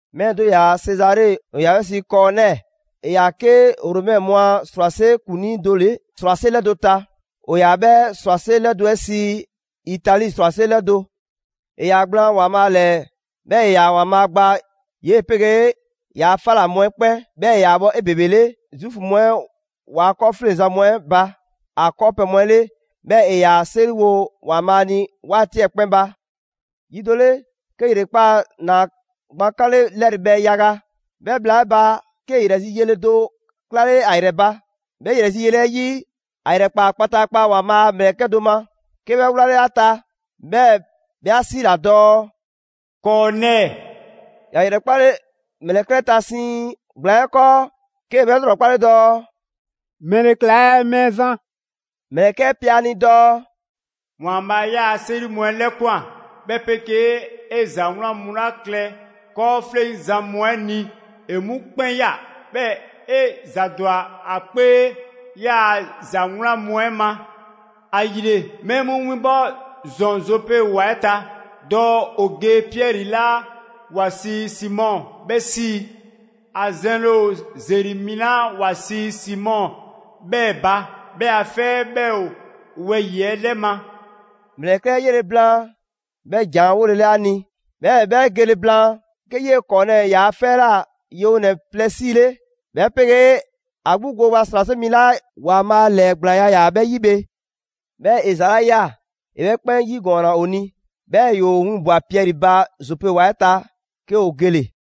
Mɛɛ do ‑yaa Sezare, ‑o ‑yaa 'bhɛ sii Kɔɔnɛɛ. ‑E ‑yaa 'ke Romɛ mu a ‑srwase' ‑kuŋlii do 'le ‑srwase' 'lɛdo‑ ta, ‑o ‑yaa 'bhɛ ‑srwase' 'lɛdo‑ 'ɛ sii: «Itali ‑srwase' 'lɛdo‑». ‑E ‑yaa gblaan ‑Waanbhaa' ‑lɛɛ, 'bhɛɛ‑ ‑e ‑yaa ‑Waanbhaa' gba 'yee‑ 'pegee ‑yaa' 'fa ꞊la mu 'ɛ 'kpɛn. 'Bhɛɛ‑ ‑e ‑yaa bhɔ 'ebebele Zuufu mu 'ɛ ‑waa' 'kɔɔfleŋzan mu 'ɛ ba ‑a 'kɔɔpɛ‑ mu 'le, 'bhɛɛ‑ ‑e ‑yaa 'seriwo ‑Waanbhaa' ni 'waati 'ɛ 'kpɛn ba. Yi do 'le, 'ke ‑yrekpaa' ‑naa gban 'kanle 'lɛrɛ bhɛ yaga, 'bhɛ bhla 'ɛ ba, 'ke ‑yrɛ zi yele do 'klale ‑a ‑yrɛ ba. 'Bhɛ ‑yrɛ zi yele 'ɛ 'yi, ‑a ‑yrɛkpaa kpataakpa ‑Waanbhaa' a ‑mlɛkɛ' do ma, 'ke 'bhɛ 'wlale ‑a ta, 'bhɛɛ‑ 'bhɛ 'a 'siila‑ dɔɔ: «Kɔɔnɛɛ!» ‑Ya ‑yrɛkpale ‑mlɛkɛ' 'ɛ ta siiŋ ‑gblaan 'ɛ 'kɔɔ, 'kee‑ 'bhɛ 'lrɔkpale dɔɔ: «‑Mɛle ‑kla ɛɛ Mɛɛzan?» ‑Mlɛkɛ' 'ɛ pe ‑a ni dɔɔ: «‑Waanbhaa' 'yaa‑ 'seri mu 'ɛ 'lɛkwan‑, 'bhɛ 'pegee 'e ‑za 'wlan mu 'la klɛ 'kɔɔfleŋzan mu 'ɛ ni ‑e 'mu 'kpɛn ꞊ya, 'bhɛɛ‑ 'e ‑za ‑dwa ‑a 'kpee 'yaa‑ ‑za 'wlan mu 'ɛ ma. ‑Ayile, mɛɛ mu winbɔ ‑zɔn Zope ‑wa 'ɛ ta, dɔɔ ‑o ge Piɛri 'la ‑wa sii Simɔ 'bhɛ 'sii. ‑A zɛnle ‑o ‑zeri mi 'la ‑wa sii Simɔ 'bhɛɛ‑ ba; 'bhɛ a 'fɛ 'ɛ 'bhɛ ‑o wɛyi‑ 'ɛ 'lɛ ma.» ‑Mlɛkɛ' 'ɛ 'yanle‑ 'bhɛ ‑jan 'ɛ 'wolele 'a ni, 'bhɛɛ‑ 'bhɛ gele blaan, 'ke 'yee‑ Kɔɔnɛɛ ‑yaa' 'fɛ 'ɛ ꞊la yewonɛ plɛ 'siile, 'bhɛ 'pegee ‑a 'gbu gooba ‑srwase' mi 'la ‑Waanbhaa' ‑lɛɛgblaanya ‑yaa 'bhɛ 'yi bhe. 'Bhɛɛ‑ ‑e ‑za 'la ꞊ya, ‑e 'bhɛ 'kpɛn 'yigɔɔnna ‑o ni, 'bhɛɛ‑ ‑yoo winbwa‑ Piɛri ba Zope ‑wa 'ɛ ta, 'ke ‑o gele‑.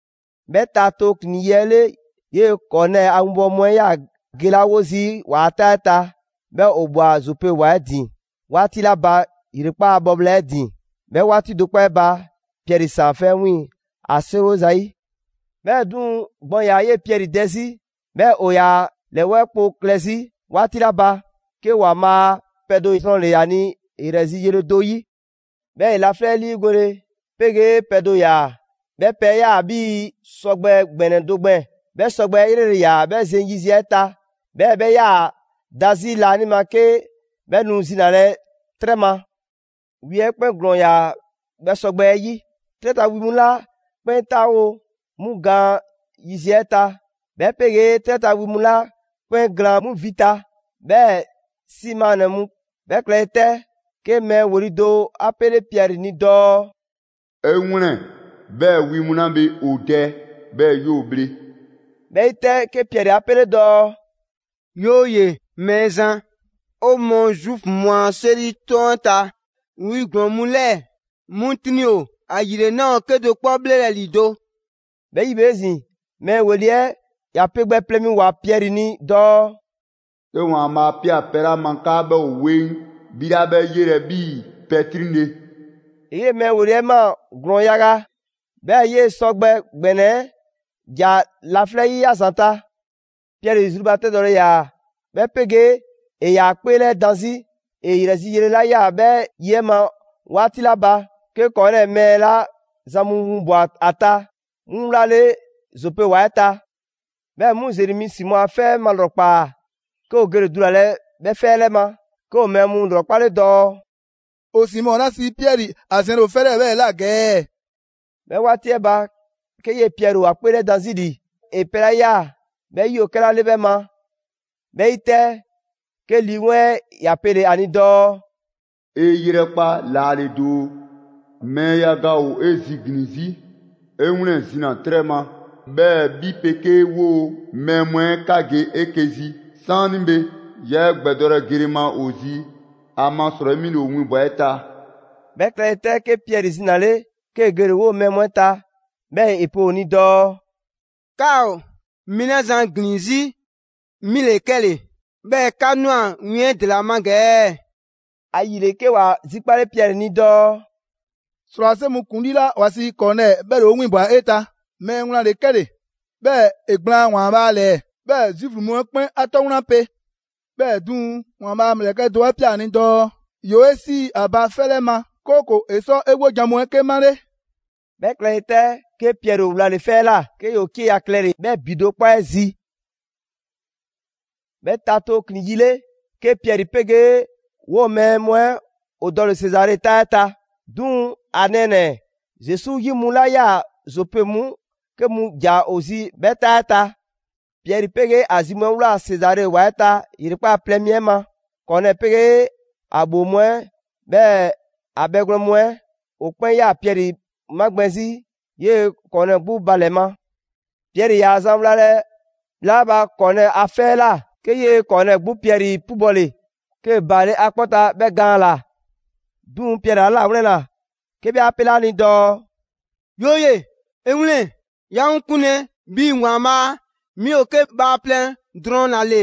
'Bhɛ ta tooklin‑ yi 'ɛ 'le, 'yee‑ Kɔɔnɛɛ a 'winbɔwo mu 'ɛ 'yaa‑ gelawo zii' ‑waa' 'taa 'ɛ ta, 'bhɛɛ‑ ‑o ꞊bhwa Zope ‑wa 'ɛ ‑din 'waati 'la ba, ‑yrekpaa' bhɔ bhla 'e ‑din, 'bhɛ 'waati do 'kpɔ 'ɛ ba, Piɛri ‑saan 'fɛ 'ɛ 'wiiŋ‑, ‑a 'seriwo ‑zayi'. 'Bhɛɛ‑ 'duŋ‑, gbɔn ‑yaa 'yee‑ Piɛri dɛ 'zi, 'bhɛɛ‑ ‑o ‑yaa ‑a ‑lɛwɛɛ' kpo klɛ 'zi 'waati 'la ba, 'ke ‑Waanbhaa' pɛ do zrɔnle‑ ‑a ni ‑yrɛ zi yele do 'yi. 'Bhɛɛ‑ ‑e laflɛ' 'ɛ 'liigole 'pegee pɛ do ꞊ya, 'bhɛ pɛ 'ɛ 'yaa‑ 'bhii‑ sɔgbɛ ‑gbɛnɛ do gbɛɛn‑: 'bhɛ sɔgbɛ 'ɛ 'yrele‑ ‑yaa 'bhɛ zeŋ yiziɛ 'ɛ ta, 'bhɛɛ‑ 'bhɛ 'yaa‑ da 'zi laanima 'ke 'bhɛ nu zinalɛ 'trɛ ma. Wi 'ɛ 'kpɛn ‑glɔɔn ‑yaa 'bhɛ sɔgbɛ 'ɛ 'yi: 'trɛ ta wi mu 'la 'kpɛn 'taawo‑ 'mu gaan yiziɛ ta, 'bhɛ 'pegee 'trɛ ta wi mu 'la 'kpɛn glaan 'mu vi ta, 'bhɛɛ‑ 'si maannɛ‑ mu. 'Bhɛ klɛle 'tɛ, 'ke mɛɛ ‑weli' do 'a 'pele Piɛri ni dɔɔ: «'E 'wlɛn‑ 'bhɛɛ‑ wi mu 'la bhe ‑o dɛ, 'bhɛɛ‑ 'yoo‑ bhle!» 'Bhɛ 'yi 'tɛ, 'ke Piɛri 'a 'pele dɔɔ: «'Yooye‑! Mɛɛzan, 'o mɔɔ Zuufu mu a 'seri 'toŋ 'ɛ ta, wi ‑glɔɔn mu 'lɛɛ‑ 'mu 'triŋ ‑o; ‑ayile 'naa ‑o 'kedo‑ 'kpɔ 'bhlelɛ‑ ‑lido'.» 'Bhɛ 'yi bhe 'ezin‑, mɛɛ ‑weli' 'ɛ ‑ya pe gbɛ plɛ mi ꞊woa Piɛri ni dɔɔ: «'Ke ‑Waanbhaa' 'a ꞊pia pɛ 'la ma 'kaa 'bhɛ ‑o 'weŋ, 'bhi 'laa 'bhɛ 'yelɛ‑ 'bhii‑ pɛ 'triŋle‑.» ‑E 'yee‑ mɛɛ ‑weli' 'ɛ ꞊maa ‑glɔɔn yaga, 'bhɛɛ‑ 'yee‑ sɔgbɛ ‑gbɛnɛ 'ɛ ‑ja laflɛ' 'yi ‑a ‑zanta'. Piɛri zrubatɛdɔle ‑yaa, 'bhɛ 'pegee ‑e ‑yaa ‑a 'kpeelɛdan 'zi ‑e ‑yrɛ zi yele 'la ꞊ya 'bhɛ 'yi 'ɛ ma 'waati 'la ba, 'ke Kɔɔnɛɛ mɛɛ 'la zan mu winbwa‑ ‑a ta, 'mu wlale‑ Zope ‑wa 'ɛ ta. 'Bhɛ mu ‑zeri mi Simɔ a 'fɛ 'ɛ malrɔkpaa, 'ke ‑o gele‑ dulalɛ 'bhɛ 'fɛ 'ɛ 'lɛ ma. 'Ke ‑o mɛɛ mu ‑lrɔkpale dɔɔ: «‑O Simɔ 'la sii Piɛri ‑a zɛnle ‑o 'fɛ 'lɛɛ‑ 'bhɛɛ‑ ꞊la ‑gɛ ɛɛ?» 'Bhɛ 'waati 'ɛ ba, 'ke 'yee‑ Piɛri ‑o ‑a 'kpeelɛdan 'zi ‑li ‑e pɛ 'la ꞊ya 'bhɛ 'yi ‑o 'kɛla 'le 'bhɛ ma. 'Bhɛ 'yi 'tɛ, 'ke Lii 'Weŋ 'ɛ ‑ya pele‑ ‑a ni dɔɔ: «'E 'yrɛkpa laale doo, mɛɛ yaga ‑o 'e ziglin‑ 'zi. 'E 'wlɛn‑, zina‑ 'trɛ ma, 'bhɛɛ‑ 'bhi 'pegee 'woo‑ mɛɛ mu 'ɛ 'ka ge 'eke‑ zi 'saanibhe; 'yaa 'e ‑gbɛdɔlɛ gele ma ‑o zi. ‑Amasrɔyi 'mi ‑le ‑o winbwa‑ 'e ta.» 'Bhɛ klɛle 'tɛ, 'ke Piɛri zinale, 'kee‑ gele‑ 'woo‑ mɛɛ mu 'ɛ ta; 'bhɛɛ‑ ‑e pe ‑o ni dɔɔ: «'Ka ‑o mɛɛ 'la zan ‑glin 'zi 'mi ‑le 'kɛle‑, 'bhɛɛ‑ 'ka ꞊nwa win 'ɛ ‑dela ma ‑gɛ ɛɛ?» ‑Ayile, 'ke ‑wa zikpale Piɛri ni dɔɔ: «‑Srwase' mu ‑kuŋlii 'la ‑wa sii Kɔɔnɛɛ 'bhɛ ‑le 'o 'winbwa꞊ 'e ta. Mɛɛ wlan ‑le 'kɛle‑, 'bhɛɛ‑ ‑e gblaan ‑Waanbhaa' ‑lɛɛ, 'bhɛɛ‑ Zuufu mu 'ɛ 'kpɛn 'a 'tɔ wlan pe. 'Bhɛɛ‑ 'duŋ‑, ‑Waanbhaa' a ‑mlɛkɛ' do 'a ꞊pia ‑a ni dɔɔ ‑yoo 'e 'sii ‑a ba 'fɛ 'lɛ ma, 'kooko‑ ‑e sɔ 'e 'wojan‑ mu 'ɛ 'ke 'male.» 'Bhɛ klɛle 'tɛ, 'ke Piɛri ‑o wlale‑ 'fɛ 'ɛ ꞊la; 'ke ‑yoo 'cieya‑ klɛle‑ 'bhɛ ‑bi do 'kpɔ 'ɛ zi. 'Bhɛ ta tooklin‑ yi 'le, 'ke Piɛri 'pegee 'woo‑ mɛɛ mu 'ɛ ‑o dɔle‑ Sezare 'taa 'ɛ ta. 'Duŋ‑ ‑a nɛɛnɛ‑ Zesu 'yi mu 'la 'yaa‑ Zope 'mu 'ke mu ‑ja ‑o zi 'bhɛ 'taa 'ɛ ta. Piɛri 'pegee ‑a zi mu 'ɛ ꞊wlaa Sezare ‑wa 'ɛ ta ‑yrekpaa' plɛ mi 'ɛ ma. Kɔɔnɛɛ 'pegee ‑a ‑bhoo mu 'ɛ, 'bhɛɛ‑ ‑a bhɛgwlɛn mu 'ɛ, ‑o 'kpɛn 'yaa‑ Piɛri 'magbɛn‑ 'zi 'yee‑ Kɔɔnɛɛ 'gbu ba ‑lɛ ma. Piɛri 'yaa‑ zan wlalɛ bhla 'la ba Kɔɔnɛɛ a 'fɛ 'ɛ ꞊la, 'ke 'yee‑ Kɔɔnɛɛ 'gbu Piɛri 'pubɔle, 'kee‑ baale' ‑a 'kpɔ ta 'bhɛ gaan ‑la. 'Duŋ‑ Piɛri 'a 'lawlɛnna, 'ke 'bhɛ 'a 'pele ‑a ni dɔɔ: «'Yooye‑, 'e 'wlɛn‑! 'Yaa‑ 'ŋ 'kunlɛ‑ 'bhii‑ ‑Waanbhaa', 'mi ‑o 'ke bhaaplɛŋ drɔŋ ‑la ‑le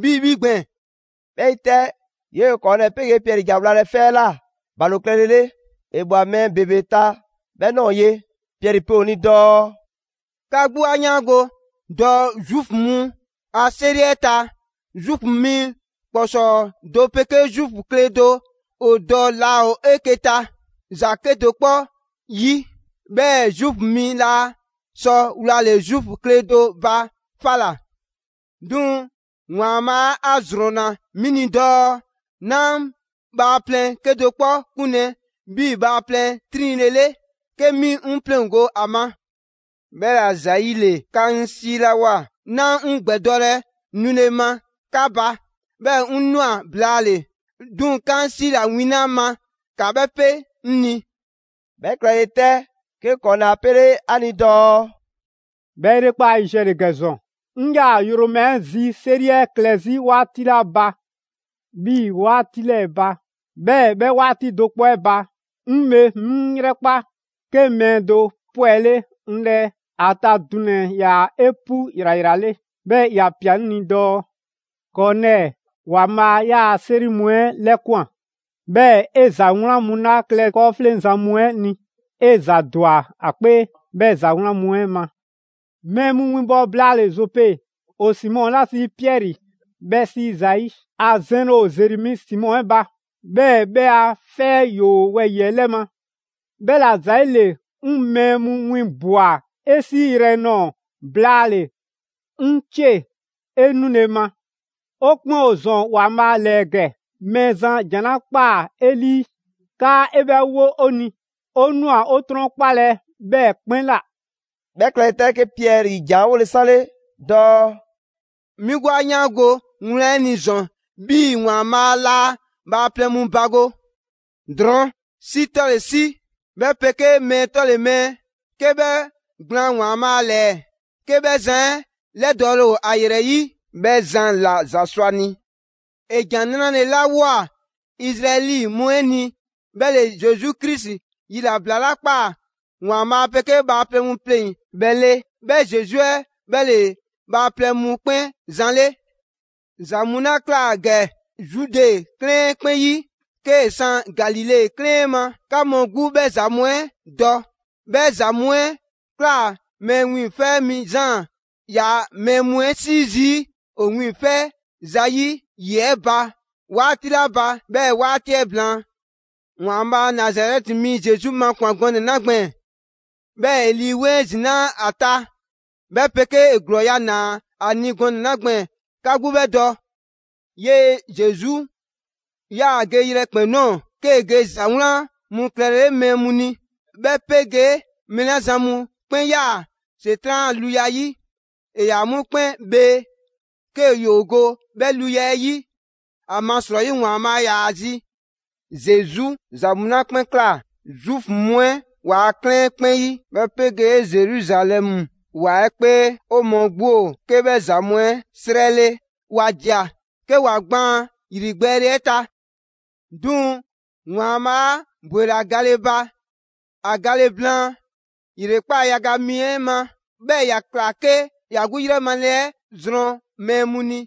'bhii‑ 'bhi gbɛɛn‑.» 'Bhɛ 'yi 'tɛ, 'yee‑ Kɔɔnɛɛ 'pegee Piɛri ‑ja wlalɛ 'fɛ 'ɛ ꞊la ‑balo klɛlele; ‑e ꞊bhwa mɛɛ ‑bebe ta 'bhɛ ꞊nɔɔ ye. Piɛri pe ‑o ni dɔɔ: «'Ka 'gbu 'a 'yaango‑ dɔɔ Zuufu mu a 'seri 'ɛ ta, Zuufu mi ‑kpɔsɔɔ do 'pegee Zuufu kle do ‑o dɔ laa ‑o 'eke‑ ta ‑za 'kedo‑ 'kpɔ 'yi, 'bhɛɛ‑ Zuufu mi laa sɔ wlale‑ Zuufu kle do ba 'fa ꞊la. 'Duŋ‑ ‑Waanbhaa' 'a ‑zrɔnna 'mi ni dɔɔ 'naa bhaaplɛŋ 'kedo‑ 'kpɔ 'kunlɛ‑ 'bhii‑ bhaaplɛŋ 'triŋle‑ 'le, 'ke 'mi 'ŋ 'pleŋgo‑ ‑a ma. 'Bhɛla‑ ‑zayile, 'ka 'ŋ 'siilawoa 'naa 'ŋ ‑gbɛdɔlɛ nule ma 'ka ba, 'bhɛɛ‑ 'ŋ ꞊nwa blaale‑. 'Duŋ‑ 'ka 'ŋ 'siila‑ win 'la ma, ‑ka 'bhɛ pe 'ŋ ni.» 'Bhɛ klɛle 'tɛ, 'ke Kɔɔnɛɛ 'a 'pele 'a ni dɔɔ: «'Bhɛ ‑yrekpaa' yiziɛ ‑le ‑gɛ ‑zɔn, 'ŋ 'yaa‑ yromazi 'seri 'ɛ klɛ 'zi 'waati 'la ba 'bhii‑ 'waati 'lɛɛ‑ ba. 'Bhɛɛ‑ 'bhɛ 'waati do 'kpɔ 'ɛ ba, 'ŋ bhe 'mi 'ŋ 'yrɛkpa, 'ke mɛɛ do 'pwɛle 'ŋ 'lɛɛ: ‑a ta dunɛ‑ 'ɛ 'yaa‑ 'epu ‑yrayrale. 'Bhɛɛ‑ ‑ya ꞊pia 'ŋ ni dɔɔ: ‹Kɔɔnɛɛ, ‑Waanbhaa' 'yaa‑ 'seri mu 'ɛ 'lɛkwan‑ 'bhɛɛ‑ 'e ‑za 'wlan mu 'la klɛ 'kɔɔfleŋzan mu 'ɛ ni, 'e ‑za ‑dwa ‑a 'kpee 'bhɛ ‑za 'wlan mu 'ɛ ma. Mɛɛ mu winbɔ blaale‑ Zope, ‑o Simɔ 'la sii Piɛri 'bhɛ 'sii zayi'. ‑A zɛnle ‑o ‑zeri mi Simɔ 'ɛ ba, 'bhɛɛ‑ 'bhɛ a 'fɛ 'ɛ ‑yoo wɛyi‑ 'ɛ 'lɛ ma.› 'Bhɛla‑ ‑zayile, 'ŋ mɛɛ mu winbwa‑ 'e 'siiyrɛ‑ nɔɔ‑ blaale‑. 'Ŋ 'cie‑, 'e nule ma! 'O 'kpɛn ‑o ‑zɔn ‑Waanbhaa' ‑lɛɛ ‑gɛ; Mɛɛzan ‑jan 'la ꞊kpaa 'e 'lii 'kaa 'e 'bhɛ 'wo 'o ni, 'o ꞊nwa 'o 'trɔnkpalɛ 'bhɛɛ‑ 'kpɛn ꞊la.» 'Bhɛ klɛle 'tɛ, 'ke Piɛri ‑jan 'ɛ 'wole‑ 'sanle dɔɔ: «'Mi 'gbu 'a 'yaango‑ wlan 'ɛ ni ‑zɔn 'bhii‑ ‑Waanbhaa' laa bhaaplɛŋ mu bago. Drɔɔn', 'si 'tɔle‑ 'si, 'bhɛ 'pegee mɛɛ 'tɔle‑ mɛɛ, 'ke 'bhɛ gblaan ‑Waanbhaa' ‑lɛɛ; 'ke 'bhɛ zan 'ɛ 'lɛdɔɔle ‑o ‑a ‑yrɛ 'yi, 'bhɛ zan ‑la ‑za sɔ ‑a ni. ‑E ‑jan 'nrale‑ 'la ꞊woa Izraɛli mu 'ɛ ni 'bhɛ ‑le Zesu Krisi yilabla 'la ꞊kpaa ‑Waanbhaa' 'pegee bhaaplɛŋ mu pleŋ‑ 'bhɛ 'le. 'Bhɛ Zesu 'ɛ 'bhɛ ‑le bhaaplɛŋ mu 'kpɛn Zan 'le. ‑Za mu 'la ꞊kla ‑gɛ Zude 'klɛɛn 'ɛ 'kpɛn 'yi, 'kee‑ san Galile 'klɛɛn 'ɛ ma, 'ka mu 'gbu 'bhɛ ‑za mu 'ɛ dɔ. 'Bhɛ ‑za mu 'ɛ ꞊kla Mɛɛ Wiiŋfɛ' Mi Zaan 'yaa‑ mɛɛ mu 'ɛ 'sii zii' ‑o wiiŋfɛ zayi' ‑yi 'ɛ ba 'waati 'la ba, 'bhɛɛ‑ 'waati 'ɛ blaan. ‑Waanbhaa' Nazarɛti mi Zesu makwan‑ gɔnɛ‑ 'la gbɛɛn‑, 'bhɛɛ‑ ‑e Lii 'Weŋ 'ɛ ‑zinaa' ‑a ta, 'bhɛ 'pegee ‑e ‑glɔɔya' ‑naa ‑a ni gɔnɛ‑ 'la gbɛɛn‑, 'ka 'gbu 'bhɛ dɔ. 'Yee‑ Zesu 'yaa‑ ge yrɛkpɛn‑ ꞊nɔɔ 'kee‑ ge ‑za 'wlan mu klɛlele mɛɛ mu ni, 'bhɛ 'pegee mɛɛ 'la zan mu 'kpɛn 'yaa‑ ‑Setran' a luya 'yi, ‑e ‑yaa 'mu 'kpɛn bhee, 'ke ‑yoo go 'bhɛ luya 'ɛ 'yi; ‑amasrɔyi ‑Waanbhaa' ‑yaa ‑a zi. Zesu ‑za mu 'la 'kpɛn ꞊kla Zuufu mu 'ɛ ‑waa' 'klɛɛn 'kpɛn 'yi, 'bhɛ 'pegee Zeruzalɛmu ‑wa 'ɛ 'kpee, 'o mɔɔ 'gbu ‑o 'ke 'bhɛ ‑za mu 'ɛ 'srɛ 'le. ‑Wa ꞊dia, 'ke ‑wa gbaan ‑yrigbɛɛle 'ɛ ta. 'Duŋ‑ ‑Waanbhaa' 'a ‑bwela gale ba ‑a gale blaan ‑yrekpaa' yaga mi 'ɛ ma, 'bhɛɛ‑ ‑ya ꞊kla 'ke ‑ya 'gbu 'yrɛ male 'ɛ zrɔn mɛɛ mu ni.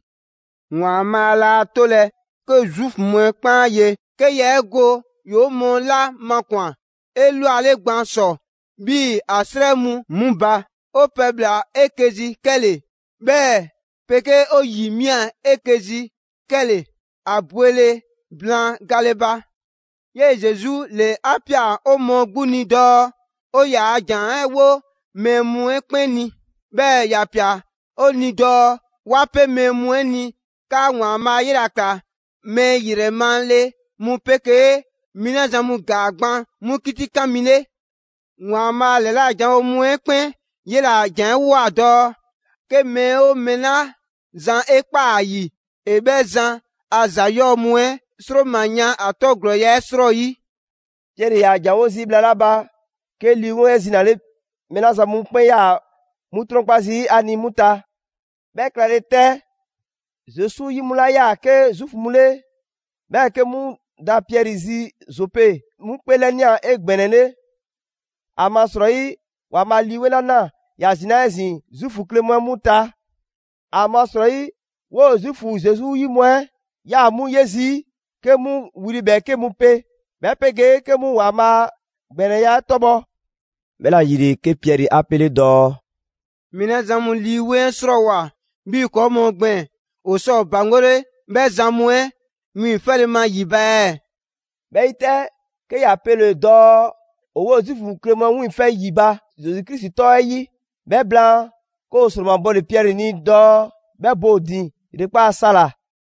‑Waanbhaa' 'laa 'tolɛ‑ 'ke Zuufu mu 'ɛ 'kpɛn 'a ye, 'ke yaa 'e go ‑yoo 'o mɔɔ 'la makwan‑ 'elwale gban ‑sɔ 'bhii‑ ‑a 'srɛ mu 'mu ba. 'O pɛbhla‑ 'eke‑ zi 'kɛle‑, 'bhɛ 'pegee 'o ‑yi ꞊mia 'eke‑ zi 'kɛle‑ ‑a bwele blaan gale ba. 'Yee‑ Zesu ‑le 'a ꞊pia 'o mɔɔ 'gbu ni dɔɔ 'o ‑yaa' ‑jan 'ɛ 'wo mɛɛ mu 'ɛ 'kpɛn ni; 'bhɛɛ‑ ‑ya ꞊pia 'o ni dɔɔ 'wa 'pe mɛɛ mu 'ɛ ni 'kaa ‑Waanbhaa' 'yela‑ ꞊kla mɛɛ ‑yrɛ male mu 'pegee mɛɛ 'la zan mu ‑gaa gban 'mu 'kitikan mi 'le. ‑Waanbhaa' ‑lɛla janwo mu 'ɛ 'kpɛn 'yela‑ a ‑janwoa dɔɔ 'ke mɛɛ 'oo mɛɛ 'la zan 'e ꞊kpaa ‑a ‑yi ‑e 'bhɛ zan a ‑za 'yɔɔ‑ mu 'ɛ ‑sroma yan ‑a 'tɔ ‑glɔɔya' 'ɛ 'srɔyi.» Piɛri ‑yaa ‑janwo' zii' bhla 'la ba, 'ke Lii 'Weŋ 'ɛ zinale mɛɛ 'la zan mu 'kpɛn 'yaa‑ 'mu 'trɔnkpa zii' ‑a ni 'mu ta. 'Bhɛ klɛle 'tɛ, Zesu 'yi mu 'la 'yaa‑ 'ke Zuufu mu 'le, 'bhɛɛ‑ 'ke 'mu ‑daa Piɛri zi Zope, 'mu 'kpeelɛnia 'egbɛnɛle. ‑Amasrɔyi ‑Waanbhaa' Lii 'Weŋ 'la ꞊naa, ‑ya ‑zinaa' 'ezin‑ Zuufu kle mu 'ɛ ta. ‑Amasrɔyi, 'woo‑ Zuufu Zesu 'yi mu 'ɛ 'yaa‑ 'mu 'ye zii' 'ke 'mu wli ‑bhɛɛke' mu 'pe, 'bhɛ 'pegee 'ke 'mu ‑Waanbhaa' a ‑gbɛnɛya 'ɛ 'tɔbhɔ. 'Bhɛla‑ ‑yile, 'ke Piɛri 'a 'pele dɔɔ: «Mɛɛ 'la zan mu Lii 'Weŋ 'ɛ 'srɔɔwoa‑ 'bhii‑ ‑kɔɔ' mu gbɛɛn‑, 'o sɔ 'o ‑baŋgole 'bhɛ zan mu 'ɛ wiiŋfɛle ma ‑yi ba ɛɛ?» 'Bhɛ 'yi 'tɛ, 'ke ‑ya pele‑ dɔɔ ‑o 'woo‑ Zuufu kle mu 'ɛ 'wiiŋfɛ‑ ‑yi ba Zesu Krisi 'tɔ 'ɛ 'yi. 'Bhɛ blaan, 'ke ‑o ‑sromabɔle Piɛri ni dɔɔ 'bhɛ bo ‑o ‑din ‑yrekpaa' sa ‑la.